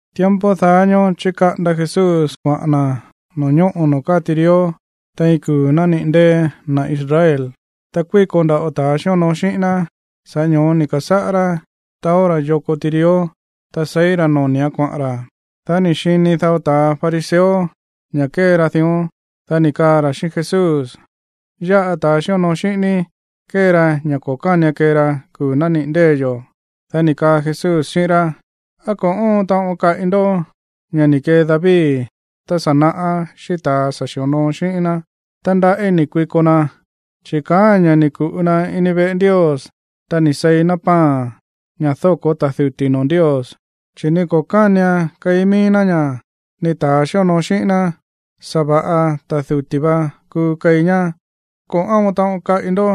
Tiempo daá ñóó chíkaꞌanda Jesús kuaꞌa̱n na̱ no̱ñóꞌo̱ noo̱ káa tirió tein iin kuu̱ nániꞌi̱ ndée̱ na̱ Israel. Ta kuíko nda̱ꞌo ta̱ xíonoo xíꞌín ná. Sa̱ꞌá ño̱ó ni̱ ka̱sáꞌá rá taó ra̱ yoko tirió, ta seí ra̱ noni̱án kuaꞌa̱n ra̱. Dá ni̱ xini dao ta̱ fariseo ña̱ kée ra dión, dá ni̱ kaa ra̱ xíꞌín Jesús: ―Yáꞌa ta̱ xíonoo xíꞌín ní kée ra ña̱ ko̱ kánian kee ra kuu̱ nániꞌi̱ ndée̱ yo̱. Dá ni̱ kaa Jesús xíꞌín rá: ―¿Á ko̱ óon taꞌon kaꞌi ndó ña̱ ni̱ kee David tá sa̱ naꞌá xíꞌín ta̱a sa̱ xi̱onoo xíꞌín ná tá ndaꞌí ni̱ kuiko na? Chi̱ kaáa̱n ña̱ ni̱ ku̱ꞌu na̱ ini veꞌe Ndios, ta ni̱ seí na̱ pan, ña̱ dóko̱ ta̱ duti̱ noo̱ Ndios, chi̱ ni ko̱ kánian keí mií ná ña̱, ni ta̱a xíonoo xíꞌín ná. Sa̱va̱ꞌa ta̱ duti̱ va kuu keí ñá. O, ¿á ko̱ óon taꞌon kaꞌi ndó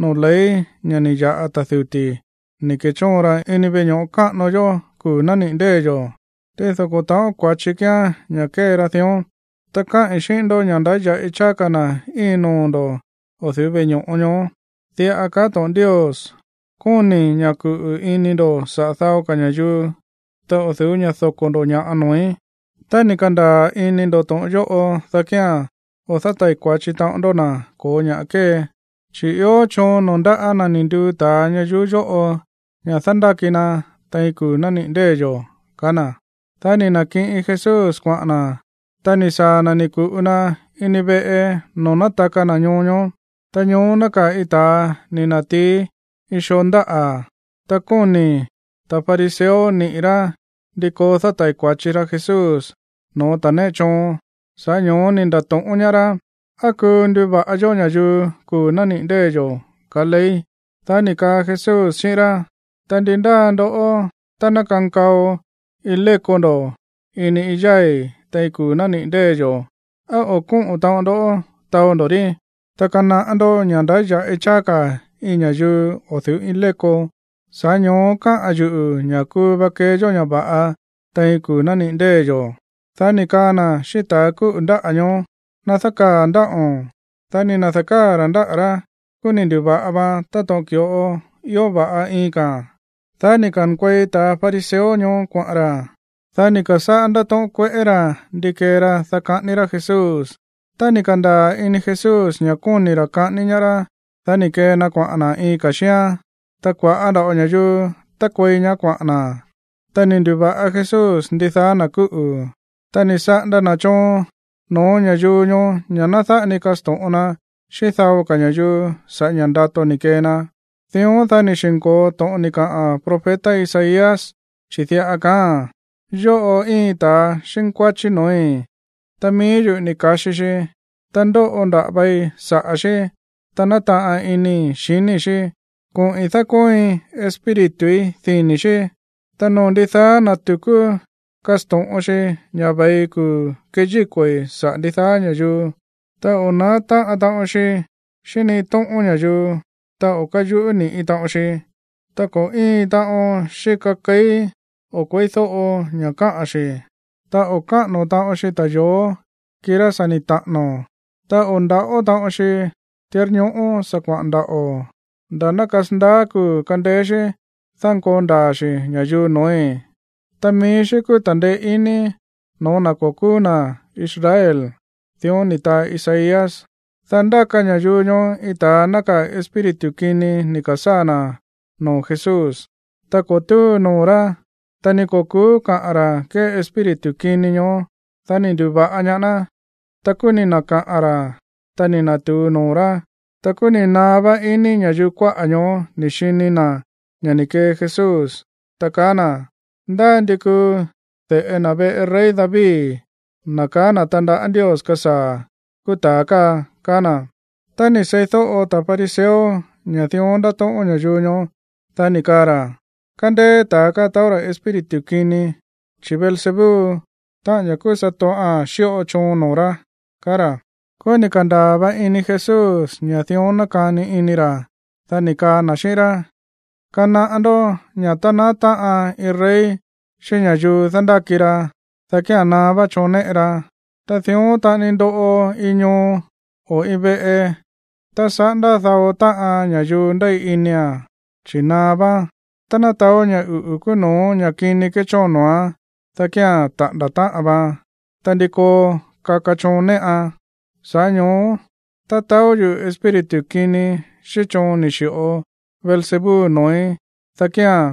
noo̱ ley ña̱ ni̱ ya̱ꞌa ta̱ duti̱ ni̱ ke̱chóon ra ini veꞌe ño̱ꞌo káꞌano yó kuu̱ nániꞌi̱ ndée̱ yo̱? Tído ko̱ ta̱ꞌón kua̱chi kíán ña̱ kée ra dión. Ta káꞌi̱n xíꞌín ndó ña̱ ndáya̱ꞌi cháá ka̱ na̱ íin noo̱ ndo̱ o̱ du̱ú veꞌe ño̱ꞌo ñoó. Diꞌa kaá to̱ꞌon Ndios: “Kóni̱i̱ ña̱ kuꞌu̱ ini ndo̱ saꞌa̱ dao ka̱ ña̱yuu, ta o̱ du̱ú ña̱ doko̱ ndo̱ ña̱ꞌa noo̱í.” Tá ni̱ ka̱ndaa̱ ini ndo̱ to̱ꞌon yóꞌo, dá kía̱n o̱ dátai̱ kua̱chi taꞌon ndó na̱ ko̱ ña̱ꞌa kée. Chi̱ ió choon noo̱ ndáꞌa̱ na̱ ni̱ nduu ta̱a ñayuú yóꞌo ña̱ dándáki na tein kuu̱ nániꞌi̱ ndée̱ yo̱ ―kaá na̱. Dá ni̱ na̱kiꞌin Jesús kuaꞌa̱n na̱. Ta ni̱ saa̱ na̱ ni̱ ku̱ꞌu na ini veꞌe noo̱ nátaka na̱ ñoo ñoó. Ta ñoó nákaa̱ iin ta̱a ni̱ na̱tií iin xoo ndáꞌa̱. Ta kóni̱ ta̱ fariseo niꞌi̱ rá ndi koo dátai̱ kua̱chi ra Jesús no̱ó ta̱ néꞌe choon, sa̱ꞌá ño̱ó ni̱ nda̱to̱ꞌón ñaá rá: ―¿Á kuu nduva̱ꞌa yó ña̱yuu kuu̱ nániꞌi̱ ndée̱ yo̱, kaá ley? Dá ni̱ kaa Jesús xíꞌín rá: ―Ta, ¿ndi ndáa ndoꞌó, tá ná kankao iin léko ndo̱ ini iin yái̱ tein kuu̱ nániꞌi̱ ndée̱ yo̱, á o̱ kóꞌo̱n taꞌon ndó taó ndo̱ rí? Ta kanaꞌá ndó ña̱ ndáya̱ꞌi cháá ka̱ iin ña̱yuu o̱ du̱ú iin léko. Sa̱ꞌá ño̱ó kaá yuꞌu̱ ña̱ kuu va kee yó ña̱ va̱ꞌa tein kuu̱ nániꞌi̱ ndée̱ yo̱. Dá ni̱ kaa na̱ xíꞌín ta̱ kúꞌu̱ ndáꞌa̱ ñoó: ―Ná dákaa̱ ndáꞌo̱n. Dá ni̱ na̱dákaa̱ ra̱ ndáꞌa̱ rá, kúú ni̱ ndu̱va̱ꞌa vaan táto̱ꞌon ki̱ꞌo ió va̱ꞌa iin ka̱a̱n. Dá ni̱ ka̱nkuei ta̱ fariseo ñoó kuaꞌa̱n ra̱. Dá ni̱ ka̱sáꞌá rá ndátóꞌón kueꞌé ra̱ ndi kee ra, dá kaꞌání rá Jesús. Tá ni̱ ka̱ndaa̱ ini Jesús ña̱ kóni̱ ra̱ kaꞌání ñaá rá, dá ni̱ kee na kuaꞌa̱n na̱ iin ka̱ xíán, ta kua̱ꞌá nda̱ꞌo ña̱yuu tákuei ñaá kuaꞌa̱n na̱. Ta ni̱ ndu̱va̱ꞌa Jesús ndidaá na̱ kúꞌu̱. Ta ni̱ saꞌanda na̱ choon no̱ó ña̱yuu ñoó ña̱ ná dáꞌa ni kasto̱ꞌon na xíꞌín dao ka̱ ña̱yuu sa̱ꞌá ña̱ ndato ni̱ kee na. Dión, dá ni̱ xi̱nko̱o to̱ꞌon ni̱ taa profeta Isaías, chi̱ diꞌa kaáa̱n: Yóꞌo íin ta xínkuáchí no̱ói̱, ta mií yuꞌu̱ ni̱ ka̱xi xi, ta ndóꞌo nda̱ꞌa vai saꞌa̱ xí, ta nátaꞌan inii̱ xiníi̱ xí. Koꞌi̱n dákóoin Espírituí dini̱ xí. Ta noo̱ ndidaá na̱ tu̱kú kasto̱ꞌon xi ña̱ ve̱i kuu̱ keyíko̱i̱ saꞌa̱ ndidaá ña̱yuu. Ta o̱ na̱á táꞌan taꞌon xi xíꞌín ni iin tóꞌón ña̱yuu, ta o̱ káyuꞌú ni̱ꞌi taꞌon xi, ta ni ko̱ íin taꞌon xíka keí o̱ kueídóꞌo ña̱ kaꞌa̱n xi̱. Ta o̱ káꞌa̱no̱ taꞌon xi ta̱yo̱ó, kirá sa̱ ni̱ taꞌa̱no̱. Ta o̱ ndaꞌó taꞌon xi tirñoꞌó sa̱ kuaꞌa̱n ndaꞌo̱, nda̱ ná kasandaá kuu̱ kandeé xí dánkoo ndaa̱ xi̱ ña̱yuu no̱ói̱. Ta mií xí kúú ta̱ndeé iní no̱ó na̱ ko̱ kúú na̱ Israel. Dión ni̱ taa Isaías. Dá ndáka ña̱yuu ñoó iin ta̱a nákaa̱ iin espíritu kini ni̱ ka̱sáa̱ na̱ noo̱ Jesús, ta ko̱ túu noo̱ rá, ta ni ko̱ ku̱ú kaꞌa̱n ra̱ kée espíritu kini ñoó. Dá ni̱ ndu̱va̱ꞌa ñaá ná. Ta kúú ni̱ na̱kaꞌa̱n ra̱, ta ni̱ na̱tu̱u noo̱ rá. Ta kúú ni̱ naá vá ini ña̱yuu kuáꞌa̱ ñoó ni̱ xini na̱ ña̱ ni̱ kee Jesús, ta kaá na̱: ―Ndá ndi kuu de̱ꞌe na̱ veꞌe rey David, na̱ kaá na̱ tandaꞌá Ndios kasaa̱, kúú ta̱a káa ―kaá na̱. Tá ni̱ seídóꞌo ta̱ fariseo ña̱ dión ndátóꞌón ña̱yuu ñoó, dá ni̱ kaa ra̱: ―Kándéé ta̱a káa taó rá espíritu kini, chi̱ Beelzebú, táꞌa̱n ña̱ kúú satoꞌa̱n, xíꞌo choon noo̱ rá ―kaá ra̱. Kúú ni̱ ka̱ndaa̱ va ini Jesús ña̱ dión nákani ini ra̱, dá ni̱ kaa na̱ xíꞌín rá: ―Kanaꞌá ndó ña̱ tá na̱á táꞌan iin rey xíꞌín ña̱yuu dándáki ra, dá kía̱n naá vá choon néꞌe ra. Ta dión taꞌani ndoꞌo iin ñoo o iin veꞌe tá saꞌándá dao táꞌan ña̱yuu ndéi inia̱n, chi̱ naá váán. Tá ná taó ña̱ uꞌu̱ kúú no̱ó ña̱ kini kéchóon noo̱án, dá kía̱n taꞌa̱nda̱ táꞌan vaan. Ta, ¿ndi koo kaka choon néꞌan? Sa̱ꞌá ño̱ó tá taó yuꞌu̱ espíritu kini xíꞌín choon ni̱ xi̱ꞌo Beelzebú noo̱í, dá kía̱n,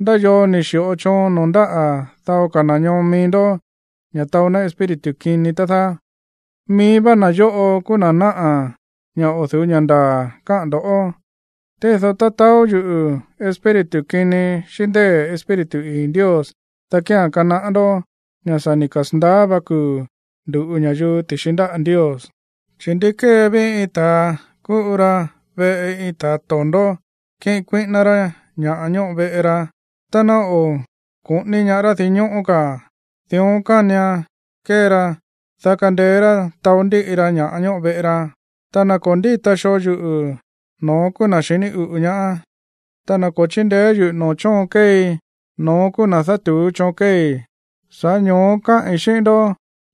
¿ndá yoo ni̱ xi̱ꞌo choon noo̱ ndáꞌa̱ dao ka̱ na̱ ñoo mií ndó ña̱ taó ná espíritu kini, tá dáá? Mií vá na̱ yóꞌo kúú na̱ náꞌa̱ ña̱ o̱ du̱ú ña̱ ndaa̱ káꞌa̱n ndo̱. Tído tá taó yuꞌu̱ espíritu kini xíꞌín ndée̱ Espíritu ii̱ Ndios, dá kía̱n kanaꞌá ndó ña̱ sa̱ ni̱ kasa̱ndaá va kuu̱ ndu̱ꞌu ña̱yuu ti̱xi ndáꞌa̱ Ndios. ’Chi̱, ¿ndi kee ví iin ta̱a ku̱ꞌu ra veꞌe iin ta̱a to̱ndó kiꞌin kuíꞌíná rá ña̱ ñóꞌo veꞌe ra tá ná o̱ koꞌóní ñaá rá dinñóꞌó ka̱? Dión kanian kee ra, dá kandeé rá taó ndíꞌi ra ña̱ꞌa ñóꞌo veꞌe ra. ’Ta na̱ ko̱ ndíta xoo yuꞌu̱, no̱ón kúú na̱ xiní uꞌu̱ ñaá, ta na̱ ko̱ chíndeé yuꞌu̱ noo̱ chóon kéei, no̱ón kúú na̱ dátu̱ú choon kéei. Sa̱ꞌá ño̱ó káꞌi̱n xíꞌín ndó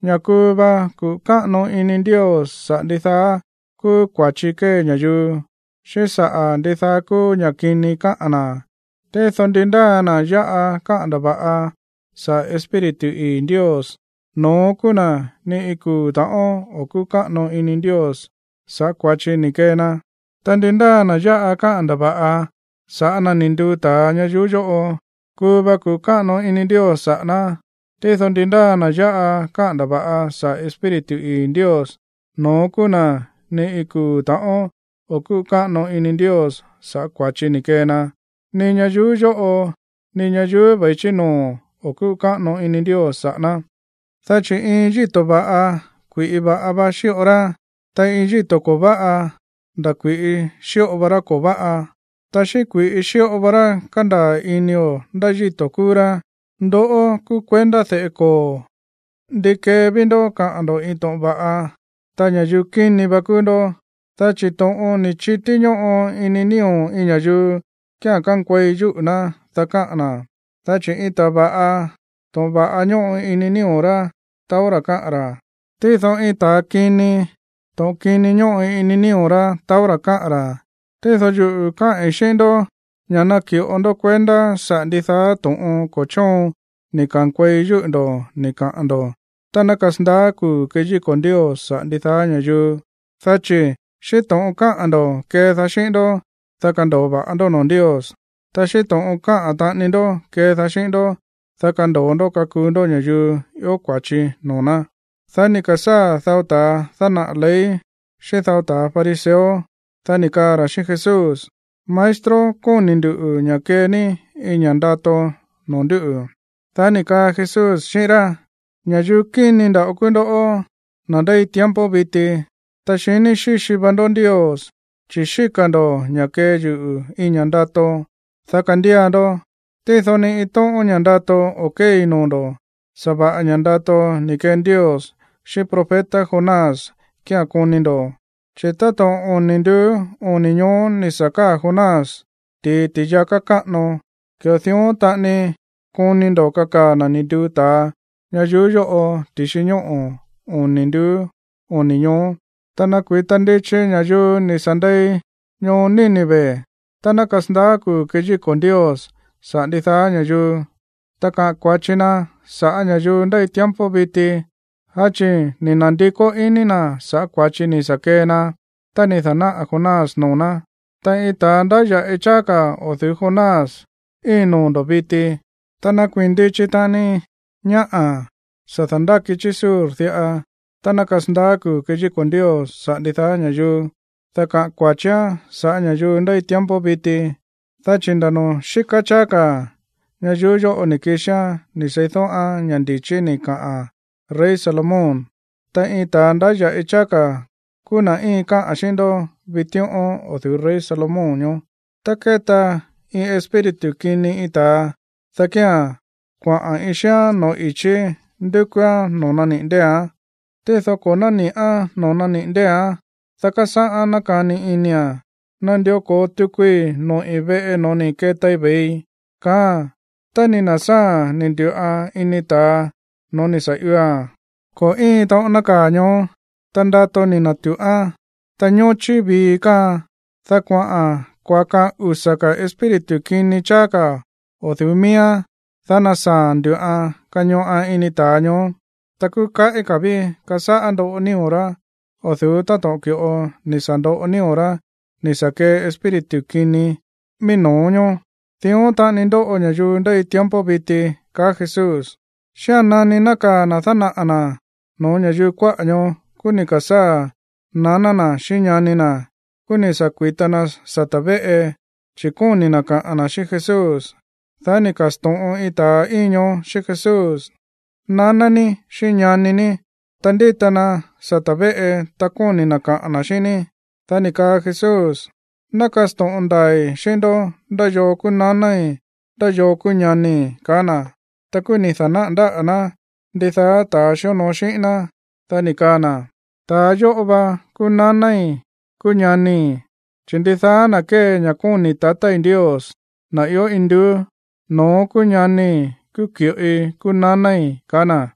ña̱ kuu va kuꞌu̱ káꞌano ini Ndios saꞌa̱ ndidaá kúú kua̱chi kée ña̱yuu, xíꞌín saꞌa̱ ndidaá kúú ña̱ꞌa kini káꞌa̱n na̱. Tído ndi ndáa na̱ yáꞌa káꞌa̱n ndava̱ꞌa saꞌa̱ Espíritu ii̱ Ndios, no̱ón kúú na̱ ni iin kuu̱ ta̱ꞌón o̱ kúꞌu̱ káꞌano ini Ndios sa̱ꞌá kua̱chi ni̱ kee na. Ta ndi ndáa na̱ yáꞌa káꞌa̱n ndava̱ꞌa sa̱ꞌá na̱ ni̱ nduu ta̱a ñayuú yóꞌo, kuu va kuꞌu̱ káꞌano ini Ndios saꞌa̱ ná. Tído ndi ndáa na̱ yáꞌa káꞌa̱n ndava̱ꞌa saꞌa̱ Espíritu ii̱ Ndios, no̱ón kúú na̱ ni iin kuu̱ ta̱ꞌón o̱ kúꞌu̱ káꞌano ini Ndios sa̱ꞌá kua̱chi ni̱ kee na, ni ñayuú yóꞌo ni ñayuú ve̱i chí noo̱ o̱ kúꞌu̱ káꞌano ini Ndios saꞌa̱ ná. ’Dá chi̱ iin yíto̱ va̱ꞌa, kui̱ꞌi va̱ꞌa va xíꞌo rá. Ta iin yíto̱ ko̱ váꞌa, nda̱ kui̱ꞌi xíꞌo va rá ko̱ váꞌa. Ta xíꞌín kui̱ꞌi xíꞌo va rá kándaa̱ inio̱ ndá yíto̱ kúú rá. ¡Ndoꞌó kúú kuendá de̱ꞌe koo̱! ¿Ndi kee ví ndó kaꞌa̱n ndo̱ iin to̱ꞌon va̱ꞌa tá ña̱yuu kíni va kúú ndó? Dá chi̱ to̱ꞌon ni̱ chití ñóꞌo ini nío̱ iin ña̱yuu kía̱n kánkuei yúꞌu̱ ná, dá káꞌa̱n na̱. Dá chi̱ iin ta̱a va̱ꞌa, to̱ꞌon va̱ꞌa ñóꞌo ini nío̱ rá taó ra̱ káꞌa̱n ra̱. Tído iin ta̱a kini, to̱ꞌon kini ñóꞌo ini nío̱ rá taó ra̱ káꞌa̱n ra̱. Tído yuꞌu̱ káꞌi̱n xíꞌín ndó ña̱ naki̱ꞌo ndó kuendá saꞌa̱ ndidaá to̱ꞌon ko̱ chóon ni̱ ka̱nkuei yúꞌu̱ ndo̱ ni̱ kaꞌa̱n ndo̱ tá ná kasandaá kuu̱ keyíko̱ Ndios saꞌa̱ ndidaá ña̱yuu. Dá chi̱ xíꞌín to̱ꞌon káꞌa̱n ndo̱, kédaá xíꞌín ndó, dá kando̱o va̱ꞌa ndó noo̱ Ndios. Ta xíꞌín to̱ꞌon káꞌa̱n taꞌani ndó kédaá xíꞌín ndó, dá kando̱o ndó kakuu ndó ña̱yuu ió kua̱chi noo̱ ná. Dá ni̱ ka̱sáa̱ dao ta̱ dánaꞌa̱ ley xíꞌín dao ta̱ fariseo, dá ni̱ kaa ra̱ xíꞌín Jesús: ―Maestro, kóni̱ ndu̱ ña̱ kee ní iin ña̱ ndato noo̱ ndúꞌu̱. Dá ni̱ kaa Jesús xíꞌín rá: ―Ña̱yuu kíni nda̱ꞌo kúú ndoꞌó, na̱ ndéi tiempo viti, ta xiní xíxi va ndó Ndios, chi̱ xíka̱ ndo̱ ña̱ kee yuꞌu̱ iin ña̱ ndato, dá kandía ndó. Tído ni iin tóꞌón ña̱ ndato o̱ kéei noo̱ ndo̱, sa̱va̱ꞌa ña̱ ndato ni̱ kee Ndios xíꞌín profeta Jonás kía̱n koni ndo̱. Chi̱ táto̱ꞌon oni̱ nduú, oni̱ ñoó ni̱ sa̱ káa̱ Jonás ti̱i ti̱yaká káꞌano, ki̱ꞌo dión taꞌani koni ndo̱ kakaa̱ na̱ ni̱ nduu ta̱a ñayuú yóꞌo ti̱xi ñóꞌo̱ oni̱ nduú, oni̱ ñoó. Ta nakui̱ta ndichi ña̱yuu ni̱ sa̱ ndei ñoo Nínive tá ná kasandaá kuu̱ keyíko̱ Ndios saꞌa̱ ndidaá ña̱yuu, ta kaꞌa̱n kua̱chi na sa̱ꞌá ña̱yuu ndéi tiempo viti. Dá chi̱ ni̱ na̱ndikó iní na̱ sa̱ꞌá kua̱chi ni̱ sa̱ kee na tá ni̱ da̱náꞌa̱ Jonás noo̱ ná. Ta iin ta̱a ndáya̱ꞌi cháá ka̱ o̱ du̱ú Jonás íin noo̱ ndo̱ viti. Ta nakuii̱n ndichi taꞌani ñáꞌa̱ sa̱ dándáki chí Sur diꞌa tá ná kasandaá kuu̱ keyíko̱ Ndios saꞌa̱ ndidaá ña̱yuu, dá kaꞌa̱n kua̱chián saꞌa̱ ña̱yuu ndéi tiempo viti, dá chi̱ nda̱ noo̱ xíká cháá ka̱ ñayuú yóꞌo ni̱ kixián ni̱ seídóꞌán ña̱ ndi̱chí ni̱ kaꞌa̱n rey Salomón. Ta iin ta̱a ndáya̱ꞌi cháá ka̱ kúú na̱ íin káꞌa̱n xíꞌín ndó vitíꞌón o̱ du̱ú rey Salomón ñoó. ’Tá kéta iin espíritu kini iin ta̱a, dá kía̱n kuaꞌa̱n iin xíán no̱ó i̱chí ndúkúán noo̱ naniꞌi̱ ndée̱án. Tído ko̱ nániꞌán noo̱ naniꞌi̱ ndée̱án. Dá kásáꞌán nákani inia̱n: “Nandió ko̱o tukui noꞌi̱ veꞌe no̱ó ni̱ ketai ve̱ii”, kaáa̱n. Tá ni̱ na̱sáa̱a̱n ni̱ ndu̱ꞌan ini ta̱a no̱ó ni̱ sa̱ ioa̱n, ko̱ íin taꞌon nákaa̱ ñoó, ta ndato ni̱ na̱tuꞌán, ta ñóchí vii káaan. Dá kuaꞌa̱n kuakaan usa̱ ka̱ espíritu kini cháá ka̱ o̱ du̱ú miíán. Dá násaa̱a̱n ndu̱ꞌan kañoꞌan ini ta̱a ñoó. Ta kúú kaꞌí ka̱ ví kásáꞌá ndóꞌo nío̱ rá o̱ du̱ú táto̱ꞌon ki̱ꞌo ni̱ sa̱ ndoꞌo nío̱ rá ni̱ sa̱ kee espíritu kini mií no̱ó ñoó. Dión taꞌani ndóꞌo ña̱yuu ndéi tiempo viti ―kaá Jesús. Xía̱n nani nákaa̱ na̱ dánaꞌa̱ na̱ no̱ó ña̱yuu kuáꞌa̱ ñoó, kúú ni̱ ka̱sáa̱ naná na̱ xíꞌín ñani na̱. Ta kúú ni̱ sa̱ kui̱ta na sata̱ véꞌe, chi̱ kóni̱ na̱ kaꞌa̱n na̱ xíꞌín Jesús. Dá ni̱ ka̱sto̱ꞌon iin ta̱a íin ñoó xíꞌín Jesús: ―Naná ní xíꞌín ñani ní, ta ndíta na sata̱ véꞌe, ta kóni̱ na̱ kaꞌa̱n na̱ xíꞌín ní. Dá ni̱ kaa Jesús: ―Ná kasto̱ꞌon ndaa̱i̱ xíꞌín ndó ndá yoo kúú nanái̱, ndá yoo kúú ñanii̱ ―kaá na̱. Ta kúú ni̱ da̱náꞌa̱ ndáꞌa̱ ná ndidaá ta̱a xíonoo xíꞌín ná, dá ni̱ kaa na̱: ―Ta̱ yóꞌo va kúú nanái̱, kúú ñanii̱. Chi̱ ndidaá na̱ kée ña̱ kóni̱ tatái̱ Ndios, na̱ ió induú, no̱ón kúú ñanii̱, kúú ki̱ꞌoi, kúú nanái̱ ―kaá na̱.